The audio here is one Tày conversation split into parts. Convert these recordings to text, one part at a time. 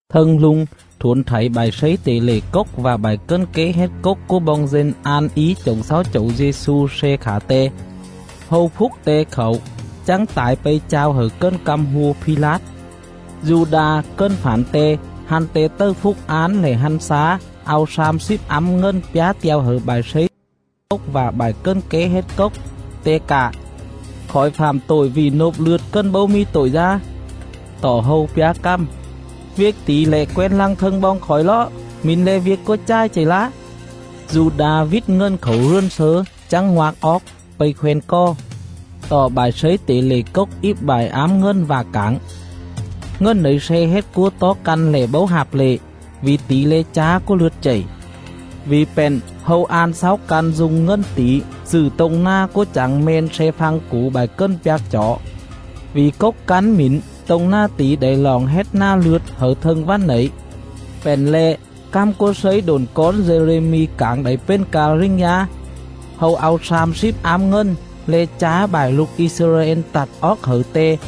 Thâng rung, thuổn thảy bại slấy tể lệ cốc vạ bại cần ké hết cốc cúa boong dân an í chổng xáu Chẩu Dê-xu sle khả Te. Hâu phúc Te khảu, chắng tải pây chao hẩư cần căm hua Phi-lát. Du-đa cần fản Te, hăn Te tầư phúc án lẻ hăn xá, au slam slíp ám ngần pjá te̱o hẩư bại slấy tể lệ cốc vạ bại cần ké hết cốc,. te cạ: “Khỏi fạm tội vỉ nôp lượt cần bấu mì tội dá!” Tọ hâu pjá cằm: “Viêc tỉ lẻ quen lăng thâng boong khỏi ló? Mỉn le̱ viêc cúa chài chầy lá.” Du-đa vít ngần khảu rườn slớ chắng ngoạc oóc, pây khoen cò. Tọ bại slấy tể lệ cốc íp bại ám ngần vạ cảng: “Ngần nẩy sle hết cúa tó căn le̱ bấu hạp lệ, vỉ tỉ le̱ chá cúa lượt chầy.” Vỉ pện, hâu an xáu căn du̱ng ngần tỉ dự tô̱ng nà cúa chảng meng sle phăng củ bại cần pjạc chỏ. Vỉ cốc cắn mỉn tô̱ng nà tỉ đảy roọng hết Nà Lượt hẩư thâng vằn nẩy. Pện le̱, cằm cúa slấy độn cón Dê-rê-mi cảng đảy pền ca rình dá: “Hâu au slam slíp ám ngần, le̱ chá bại lục I-xơ-ra-ên tặt oóc hẩư Te,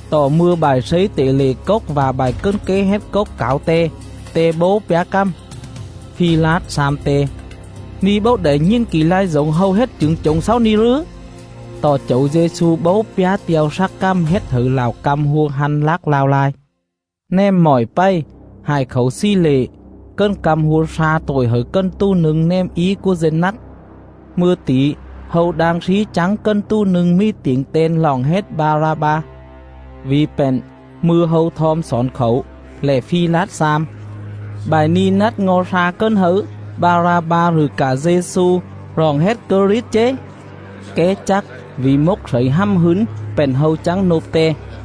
Tọ mư̱a bại slấy tể lệ cốc vạ bại cần ké hết cốc cảo Te, Te bấu pjá cằm. Phi-lát xam Te: “Ni̱ bấu đảy nhìn kỉ lai dổng hâu hết chửng chổng xáu ni̱ rừ?” Tọ Chẩu Dê-xu bấu pjá te̱o slắc cằm hết hẩư lạo căm hua hăn lác lao lai. Nèm mọi pày, hại khảu slì lệ, cần căm hua sla tội hẩư cần tù nâng nèm í cúa dân nắt. Mư̱a tỉ, hâu đang slí chắng cần tù nâng mì tiểng ten roọng hết Ba-ra-ba. Vỉ pện, mư̱a hâu thom xỏn khảu, lẻ Phi-lát xam: “Bại ni̱ nắt ngo̱ sla cần hâư Ba-ra-ba rụ cạ Dê-xu roọng hết Krit chế?” Ké chắc vỉ mốc slẩy hằm hứn pện hâu chắng nôp Te.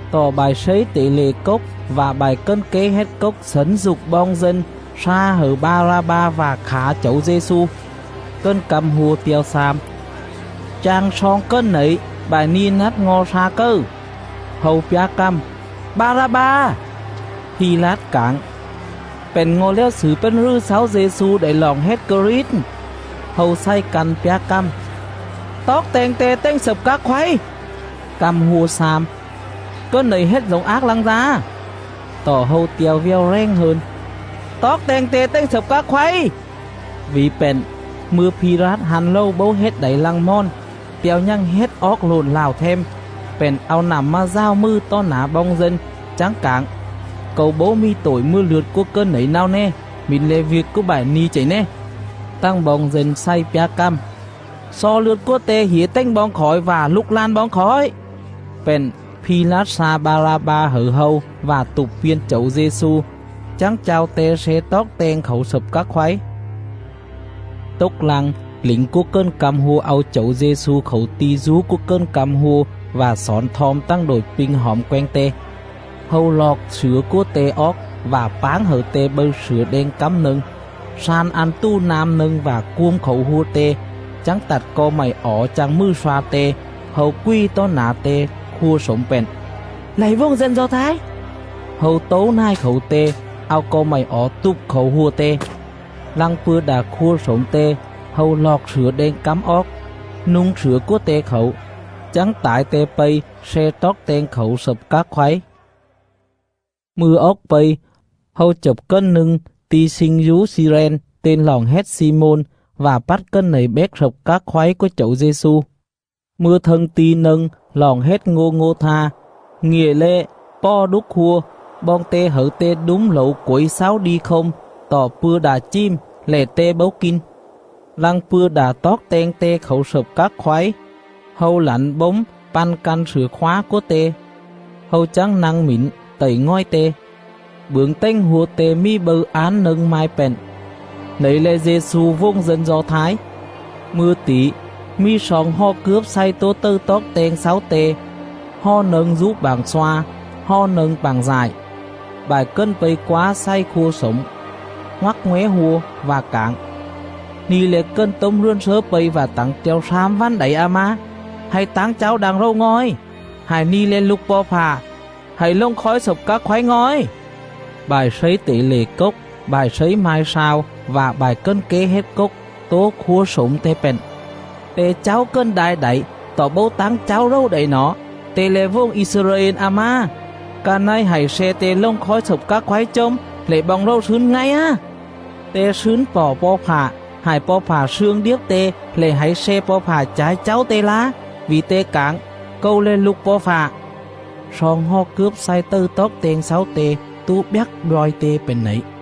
Tọ bại slấy tể lệ cốc vạ bại cần ké hết cốc xẩn dục boong dân sla hẩư Ba-ra-ba vạ khả Chẩu Dê-xu. Cần căm hua te̱o xam: “Chang sloong cần nẩy bại ni̱ nắt ngo̱ sla cầư?” Hâu pjá cằm: “Ba-ra-ba.” Phi-lát cảng: “Pện ngo̱ lèo xử pền rừ xáu Dê-xu đảy roọng hết Krit?” Hâu xày căn pjá cằm: “Toóc teng te tềnh slập các khoáy!” Căm hua xam: “Cần nẩy hết dổng ác lăng dá?” Tọ hâu te̱o vèo rèng hơn: “Toóc teng te tềnh slập các khoáy!” Vỉ pện, mư̱a Phi-lát hăn rầu bố hết đảy lăng mòn, te̱o nhằng hết oóc lộn lạo them, pện au nặm mà dào mừ tó nả boong dân, chắng cảng: “Câu bấu mì tội mừa lượt cúa cần nẩy náo né; mỉn le̱ viêc cúa bại ni̱ chầy né.”. Tằng boong dân xày pjá cằm: “Xo lượt cúa te hỉa tềnh boong khỏi vạ lục lan boong khỏi!” Pện Phi-lát sla Ba-ra-ba hẩư hâu, vạ tụp piên Chẩu Dê-xu, chắng chao Te sle toóc teng khảu slập các khoáy. Tốc lăng, lỉnh cúa cần căm hua au Chẩu Dê-xu khảu ti̱ dú cúa cần căm hua vạ xỏn thom tằng đội pinh hỏm quenh Te. Hâu loọc slửa cúa Te oóc vạ páng hẩư Te bâư slửa đeng cắm nâng, slan ăn tù nam nâng vạ cuôm khảu hua Te, chắng tặt co mạy ỏ chang mừ sloa Te. Hâu qui̱ tó nả Te, khua slổm pện: “Lạy vuồng dân Do Thái.” Hâu tấu nài khảu Te, au co mạy ỏ tụp khảu hua Te. Lăng pư̱a đạ khua slổm Te, hâu loọc slửa đeng cắm oóc, nu̱ng slửa cúa Te khảu, chắng tải pây sle toóc teng khảu slập các khoáy. Mư̱a oóc pây, hâu chập cần nâng ti̱ sling dú Xi-ren ten roọng hết Xi-môn, vạ pắt cần nẩy béc slập các khoáy cúa Chẩu Dê-xu. Mư̱a thâng ti̱ nâng roọng hết Ngô-ngô-tha, ngịa le̱ Pò Đúc Hua, boong te hẩư Te đúm lẩu quẩy xáu đi khôm; tọ pư̱a đạ chìm, lẻ Te bấu kin.. Lăng pư̱a đạ toóc teng Te khảu slập các khoáy, hâu lẳn bốm păn căn slửa khóa cúa Te.. Hâu chắng nă̱ng mỉn tậy ngòi Te. Bưởng tềnh hua Te mì bâư án nâng mai pện: “NẨY LE̱ DÊ-XU, VUỒNG DÂN DO THÁI.” Mư̱a tỉ, mì sloong hò cướp xày tố tầư toóc teng xáu Te: hò nâng dú pạng sloa, hò nâng pạng dại. Bại cần pây quá xày khua slổm, ngoắc ngóe hua. vạ cảng: “Ni̱ le̱ cần tốm rườn slớ pây vạ tẳng te̱o slam vằn đảy a má, hạy táng cháu đang rầu ngòi! Hại ni̱ le̱ Lục Po̱ Fạ, hạy lồng khói slập các khoáy ngòi!”. Bại slấy tể lệ cốc, bại slấy mai slao vạ bại cần ké hết cốc tố khua slổm Te pện: “Te cháu cần đai đảy, tọ bấu táng cháu rầu đảy nỏ. Te le̱ vuồng I-xơ-ra-ên a má! Ca này hạy sle te lồng khói slập các khoáy chồm, lẻ boong rầu slứn ngay á. Te slứn pọ Po̱ Fạ. Hại Po̱ Fạ slương điếp te lẻ hạy sle Po̱ Fạ cha̱i cháu te lá; vỉ te cảng: ‘Câu le̱ Lục Po̱ Fạ.’”. Sloong hò cướp xày tầư toóc teng xáu Te tố bjắc bjoi Te pện nẩy.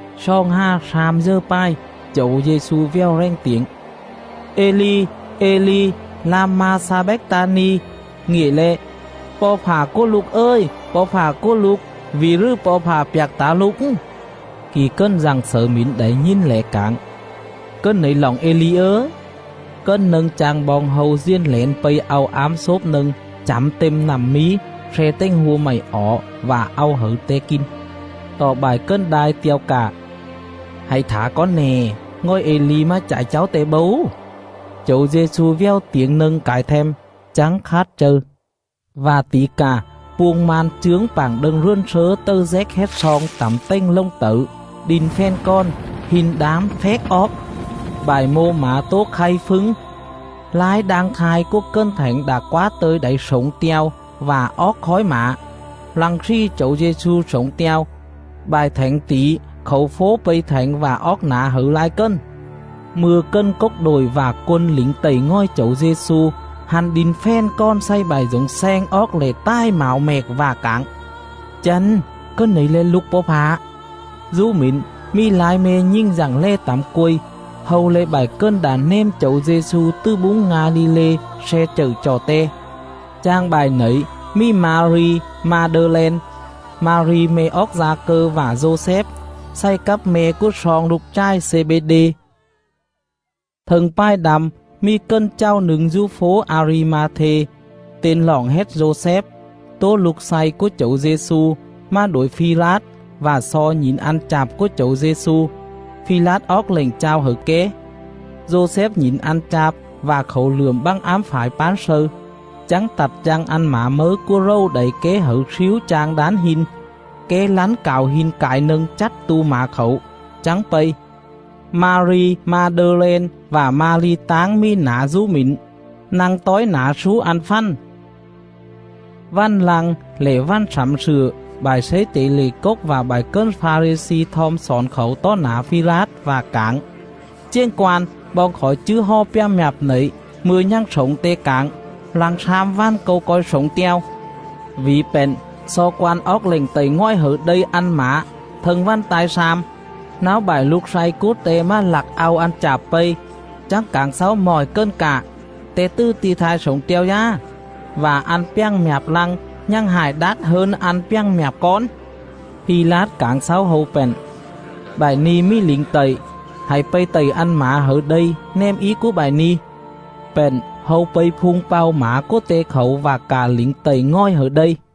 Xoòng hà slam dờ pài, Chẩu Dê-xu vèo rèng tiểng: “Ê-li, Ê-li, lam-ma-xa-bách-ta-ni?” Ngịa le̱: “Po̱ Fạ cúa lục ời! Po̱ Fạ cúa lục! Vỉ rừ Po̱ Fạ pjạc tả lục?”. Kỉ cần dặng xẩư mỉn đảy nhìn lẻ cảng: “Cần nẩy roọng Ê-li ớ.” Cần nâng chang boong hâu diền lẻn pây au ám xốp nâng chẳm têm nặm mí, sle tềnh hua mạy ỏ vạ au hẩư Te kin.. Tọ bại cần đai te̱o cạ: “Hạy thả cón nè, ngòi Ê-li mà cha̱i cháu te bấu.” Chẩu Dê-xu vèo tiểng nâng cải them, chắng khát châư. Vạ tỉ cà, puông man chướng pạng đâng rườn slớ tầư déc hết sloong tẳm tềnh lồng tẩư, đin fèn kòn, hin đán phéc oóc;. Bại mô mả tố khay phứng, lai đang thai cúa cần thảnh đạ quá tơ̱i đảy slổng te̱o vạ oóc khói mả. Lăng slì Chẩu Dê-xu slổng te̱o, bại thảnh tỉ khảu fố pây thảnh vạ oóc nả hẩư lai cần. Mư̱a cần cốc đội vạ quân lỉnh tậy ngòi Chẩu Dê-xu, hăn đin fèn kòn xày bại dổng sleng oóc lẻ tài mảo mẹc vạ cảng: “Chăn, Cần nẩy le̱ Lục Po̱ Fạ.” Dú mỉn mì lai me̱ nhình dặng lè tẳm quây. Hâu le̱ bại cần đạ nèm Chẩu Dê-xu tứ búng Nga-li-lê, sle chậư chọ Te.. Chang bại nẩy mì Ma-ri Ma-đơ-len, Ma-ri me̱ oóc Da-cơ vạ Dô-xép, xày cắp me̱ cúa sloong lục chài Xê-bê-đê. Thâng pài đăm, mì cần chàu nâng dú fố A-ri-ma-thê, ten roọng hết Dô-xép, tố lục slay cúa Chẩu Dê-xu, mà đuổi Phi-lát vạ xo nhỉn ăn chạp cúa Chẩu Dê-xu. Phi-lát oóc lệnh chao hẩư ké. Dô-xép nhỉn ăn chạp vạ khảu lượm bă̱ng ám phải pán slâư, chắng tặt chang ăn mả mấư cúa rầu đảy ké hẩư slíu chang đán hin. Ké lắn cảo hin cải nâng chắt tu mả khảu, chắng pây. Ma-ri Ma-đơ-len vạ Ma-ri táng mì nả dú mỉn, nă̱ng tói nả slú ăn fằn. Vằn lăng, lẻ vằn Slẳm Slựa, bại slấy tể lệ cốc vạ bại cần Pha-ri-xi thom xỏn khảu tó nả Phi-lát, vạ cảng: “Chiềng quan, boong khỏi chứ hò pjàng mjạp nẩy mư̱a nhằng slổng te cảng: ‘Lăng slam vằn Câu co̱i slổng te̱o.’. Vỉ pện, xo quan oóc lệnh tậy ngòi hẩư đây ăn mả thâng vằn ta̱i slam, náo bại lục slay cúa te mà lặc au ăn chạp pây, chắng cảng xáu mọi cần cạ ‘Te tứ ti̱ thai slổng te̱o dá,’ vạ ăn pjàng mjạp lăng nhằng hại đát hơn ăn pjàng mjạp cón.” Phi-lát cảng xáu hâu pện: “Bại ni̱ mì lỉnh tậy, hạy pây tậy ăn mả hẩư đây nèm í cúa bại ni̱.” Pện hâu pây phung pao mả cúa Te khảu vạ cạ lỉnh tậy ngòi hẩư đây.